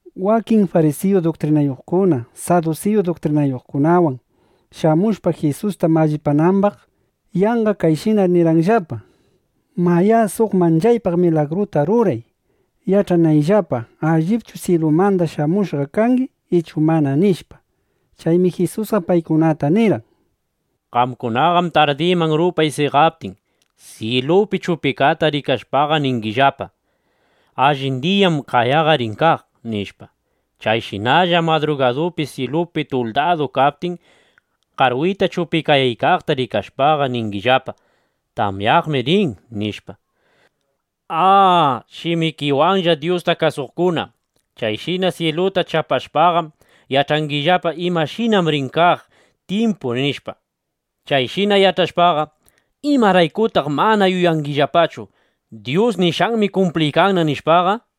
Wakin farisiyu duktrinayuqkuna sadusiyu duktrinayuqkunawan shamushpam Jisusta mallipanambaq, yanqa kayshina nirqanllapa: —Mayá, suq manchaypaq milagruta ruray yach'anaypaqllapa, allipchu syilumanda shamushqa kangi ichu mana, nishpa. Chaymi Jisusqa paykunata nirqan: —Qamkunaqam tardiman rupay seqaptin, syilupi chupikata rikashpaqa, ningillapa: “Allin diyam qayaqa rin kaq”, nishpa. Chayshinallam madrugadupi syilu tuldadu kaptin, qarwita chupikayaykaqta rikashpaqa, ningillapa: “Tamyaqmi rin”, nishpa. ¡A shimikiwanlla Dyusta kasuqkuna! Chayshina syiluta chapashpam, yach'angillapa, imashinam rin kaq tyimpu, nishpa. Chayshina yach'ashpaqa, ¿imaraykutaq mana yuyangillapachu, Dyus nishqanmi kumpliykanna, nishpaqa?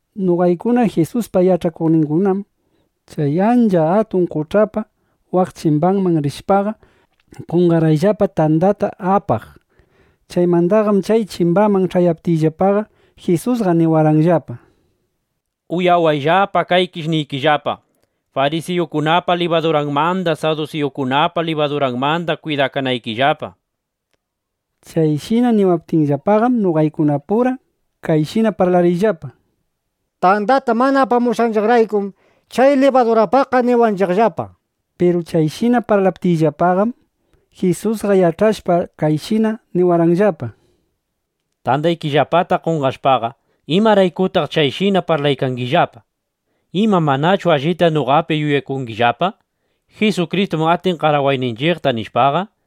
Noqaykuna Jisuspa yach'akuqningunam chay ancha atun qoch'apa waq chimbanman rishpaqa, qonqarqayllapa tandata apaq. Chaymandaqam chay chimbaman ch'ayaptiyllapaqa, Jisusqa niwarqanllapa: —Uyawayllapa, kaykish niykillapa, farisiyukunapa libaduranmanda, sadusiyukunapa libaduranmanda kwidakanaykillapa, nishpa. Chayshina niwaptinllapaqam, noqaykunapura kayshina parlarqayllapa: —Tandata mana apamushqanchiqraykum chay libadurapaqqa niwanchiqllapa. Piru chayshina parlaptiyllapaqam, Jisusqa yach'ashpa, kayshina niwarqanllapa: —Tandaykillapata qonqashpaqa ¿imaraykutaq chayshina parlaykangillapa? ¿Ima manachu allita noqapi yuyakungillapa: Jisukristum atin qarawayninchiqta, nishpaqa?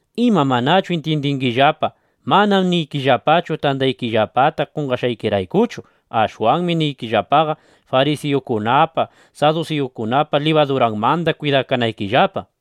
¿Ima manachu intyindingillapa? Manam niykillapachu, tandaykillapata qonqashqaykiraykuchu. Ashwanmi niykillapaqa, farisiyukunapa, sadusiyukunapa libaduranmanda kwidakanaykillapa, nishpa.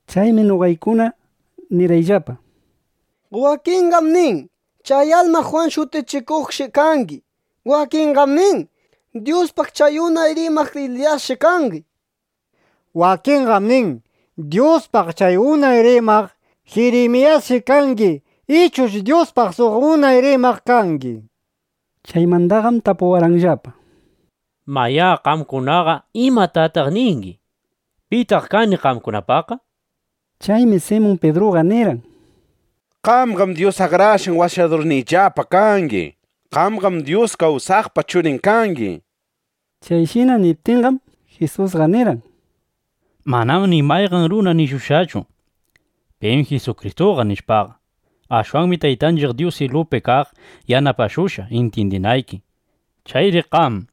Chaymi noqaykunaqa nirqayllapa: —Wakinqam nin chay alma Jwan Shutichikuqshi kangi. Wakinqam nin: Dyuspaq chay unay rimaq Eliyasshi kangi. Wakinqam nin: Dyuspaq chay unay rimaq Jirimiyasshi kangi ichush Dyuspaq suq unay rimaq kangi, nishpa. Chaymandaqam tapuwarqanllapa: —Mayá, qamkunaqa ¿imatataq ningi? ¿Pitaq kani qamkunapaqqa? nishpa. Chaymi Simun Pidruqa nirqan: —Qamqam Dyus Akrashqan Washadurniyllapa kangi. Qamqam Dyus kawsaqpa Churin kangi, nishpa. Chayshina niptinqam, Jisusqa nirqan: —Manam ni mayqan runa nishushqachu: pim Jisukristuqa, nishpaqa. Ashwanmi Taytanchiq Dyus syilupi kaq yanapashushqa intyindinayki. Chayri qam,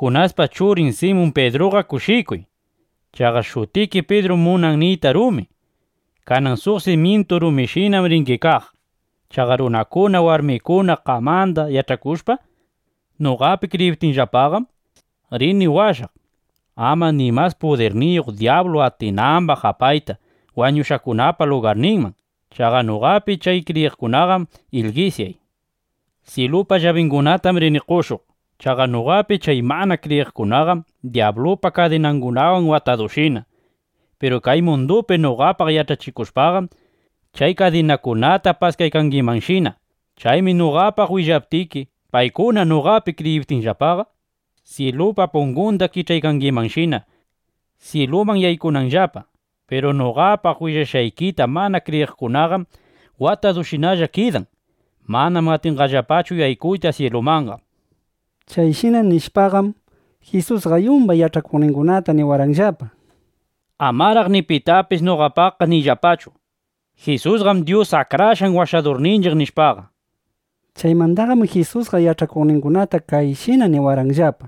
Junaspa churin Simun Pidruqa kushikuy. (Chaqa shutiki “Pidrum” munan niyta “rumi.”) Kanan suq simyintu rumishinam ringi kaq. Chaqa runakuna, warmikuna qamanda yach'akushpa, noqapi kriyiptinllapaqam, rini washaq, ama ni mas pudirniyuq dyablu atinambaq apayta wañushqakunapa lugarninman. Chaqa noqapi chay kriyiqkunaqam ilgisyay. Syilupa llabingunatam rini qoshuq. Chaqa noqapi chay mana kriyiqkunaqam dyablupa kadinangunawan watadushina. Piru kay mundupi noqapaq yach'achikushpaqam, chay kadinakunata paskaykangimanshina. Chaymi noqapaq willaptiki, paykuna noqapi kriyiptinllapaqa, syilupa pungunda kich'aykangimanshina, syiluman yaykunanllapa. Piru noqapaq willashqaykita mana kriyiqkunaqam watadushinalla kidan. Manam atinqallapachu yaykuyta syilumanqa. Chayshina nishpaqam, Jisusqa yumbay yach'akuqningunata niwarqanllapa: —Amaraq ni pitapis noqapaqqa niyllapachu: “Jisusqam Dyus Akrashqan Washadurninchiq”, nishpaqa. Chaymandaqam Jisusqa yach'akuqningunata kayshina niriwarqanllapa: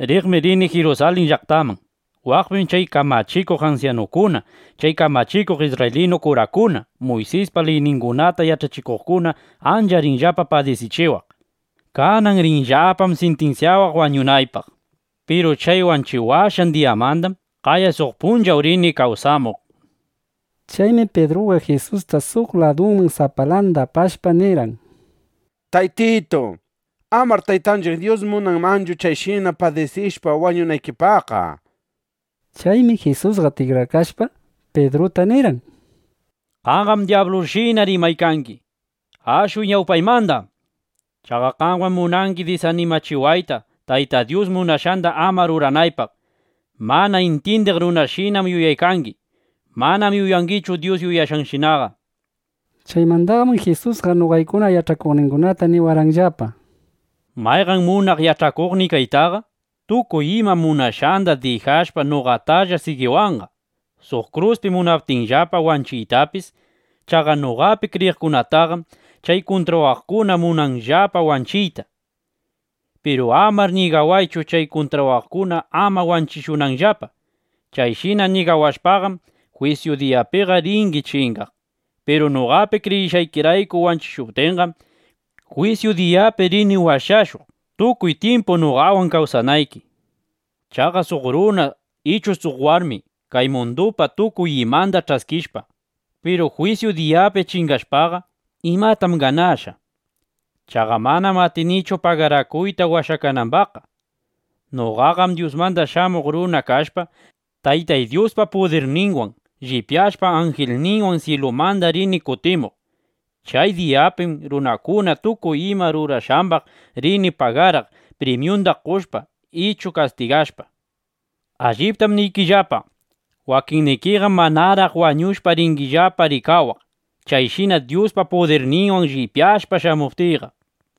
—Riqmi rini Jirusalin llaqtaman. Waqpim chay kamachikuq ansyanukuna, chay kamachikuq isrraylinu kurakuna, Muysispa liyningunata yach'achikuqkuna ancha rinllapa padisichiwaq. Kanan rinllapam sintinsyawaq wañunaypaq. Piru chay wanchiwashqan diyamandam qaya suq punchawnin rini kawsamuq, nishpa. Chaymi Pidruqa Jisusta suq laduman sapalanda apashpa, nirqan: —Taytitu, amar Taytanchiq Dyus munanmanchu chayshina padisishpa wañunaykipaqqa, nishpa. Chaymi Jisusqa tikrakashpa, Pidruta nirqan: —¡Qamqam dyablushina rimaykangi! ¡Ashuy ñawpaymanda! Chaqa qamqam munangi disanimachiwayta, Tayta Dyus munashqanda ama ruranaypaq. Mana intyindiq runashinam yuyaykangi. Manam yuyaykangichu Dyus yuyashqanshinaqa, nishpa. Chaymandaqam Jisusqa noqaykuna yach'akuqningunata niwarqanllapa: —Mayqan munaq yach'akuqniy kaytaqa tukuy ima munashqanda dijashpa, noqatalla sigiwanqa, suq kruspi munaptinllapa wanchiytapis. (Chaqa noqapi kriyiqkunataqam chay kuntrawaqkuna munanqallapa wanchiyta.) Piru amar ñigawaychu, chay kuntrawaqkuna ama wanchishunanllapa. Chayshina ñigawashpaqam, jwisyu diyapiqa ringi chingaq. Piru noqapi kriyishqaykirayku wanchishuptinqam, jwisyu diyapi rini washashuq, tukuy tyimpu noqawan kawsanayki. Chaqa suq runa ichu suq warmi kay mundupa tukuy imanda ch'askishpa, piru jwisyu diyapi chingashpaqa, ¿imatam ganashqa? Chaqa manam atinchu pagarakuyta washakanambaqqa. Noqaqam Dyusmanda Shamuq Runa kashpa, Taytay Dyuspa pudirninwan llipyashpa, anjilningunawan syilumanda rini kutimuq. Chay diyapim runakuna tukuy ima rurashqambaq rini pagaraq, primyunda qoshpa, ichu kastigashpa. Alliptam niykillapa, wakinnikiqam manaraq wañushpa, ringillapa rikawaq, chayshina Dyuspa pudirninwan llipyashpa, shamuptiyqa.